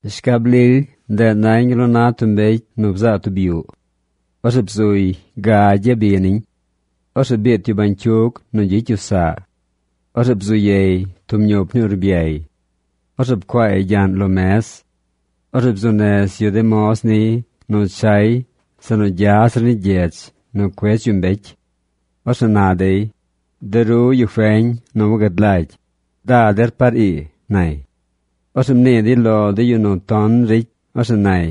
Shcab lily, ndeꞌ nañ gal nu na tub mbecy nu bzaa tub yuꞌ. Orzeꞌ bzuy gagy yabi niñ. Orzeꞌ biit yu bañcyug nu gyicy yu saꞌ. Orzeꞌ bzu yey tub ñup ni urbyay. Orzeꞌ pcuaay gyaꞌñ lo mez. Orzeꞌ bzuu nez yu de moz niy nu chay zeꞌ nu gya zir ni gyedz nu cuedz yu mbecy. Orzeꞌ na dey: “De ru, yu feñ nu wagad lagy, ¡da der par ii!”, nay. Orzeꞌ mnii dey lo de yu nu ton ricy, orzeꞌ nay: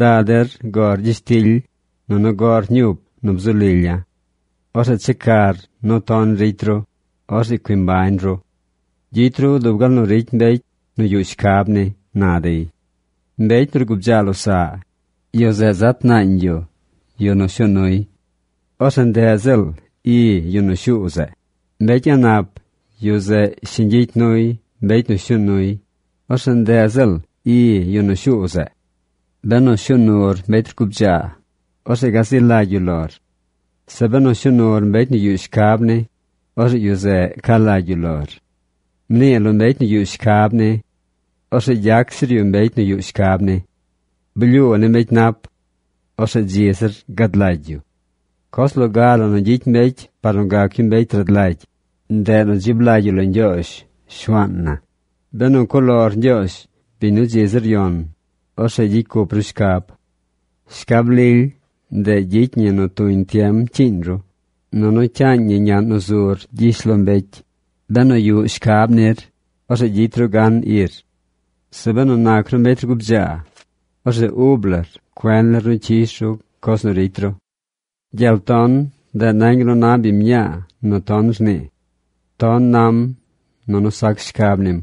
“Da der gor gyishtily, nunu goꞌr ñup nu bzu lilya̱. Orzeꞌ checar nu ton ricy ru. Orzeꞌ cui mbañ ru. Gyicy ru dub gal nu ricy mbecy nu yuꞌ shcab ni”, na dey. Mbecy nu rgubdzaa losaꞌ, yu zeꞌ zat naañ yu yu nu shuu nuy. Orzeꞌ ndeꞌ ziꞌl i yu nu shuu zeꞌ. Mbecy a̱ꞌ nap, yu zeꞌ shiñ gyicy nuy mbecy nu shuu nuy. Orzeꞌ ndeꞌ ziꞌl i yu nu shuu zeꞌ. Benu pshuu nur mbecy rgubdzaa, orzeꞌ gazi lagy yu lor. Zeꞌ benu shuu nur mbecy nu yuꞌ shcab ni, orzeꞌ yu zeꞌ ca lagy yu lor. Mnii lo mbecy nu yuꞌ shcab ni. Orzeꞌ gyac zir yu mbecy nu yuꞌ shcab ni. Blyuu ni mbecy nap. Orzeꞌ dzi zir gad lagy yu. Coz loga la nu gyicy mbecy par nu gac yu mbecy rad lagy, ndeꞌ nu dzib lagy yu lo Ñgyoozh, Shuaan na. Benu cuꞌ lor Ñgyoozh, biñ nu dzi zir yon, orzeꞌ gyicy cup ru shcab. Shcab lily, ndeꞌ gyicy ñi nu tuñ tiem cyiiñ ru, nunu cyaañ ñi ñaꞌn nu zur gyishlombecy. Benu yuꞌ shcab nir, orzeꞌ gyicy ru gan ir. Zeꞌ benu nac ru mbecy rgubdzaa, orzeꞌ ub lar cuen nir nu cyish ru coz nu ricy ru. Gyel ton, ndeꞌ nañ gal nu na biñ mñaa nu ton rnii. Ton nam nunu sac shcab nim.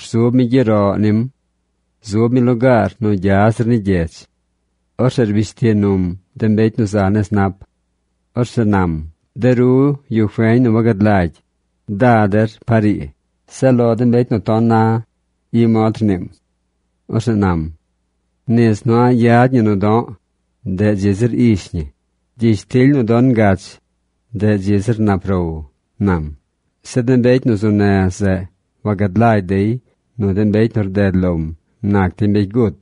Rzub mi gyeroꞌ nim. Zub mi lugaar nu gya zir ni gyedz. Orzeꞌ rbish ti num de mbecy nu za nez nap. Orzeꞌ nam: “¡De ru, yu feñ nu wagad lagy, da der par ii!” Zeꞌ lo de mbecy nu ton, i mod rniim. Orzeꞌ nam: “Nis nu a̱ꞌ yad ñi nu do̱ꞌ, ndeꞌ dzi zir ish ñi. Gyishtily nu don ngach, ndeꞌ dzi zir nap row”, nam. Zeꞌ de mbecy nu zu nez zeꞌ, wagad lagy dey nu de mbecy nu rdeꞌ lom nac dey mbecy gut.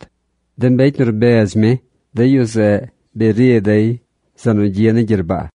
De mbecy nu rbedz mi, de yu zeꞌ bi ri dey zeꞌ nu gyi ni gyerbaa.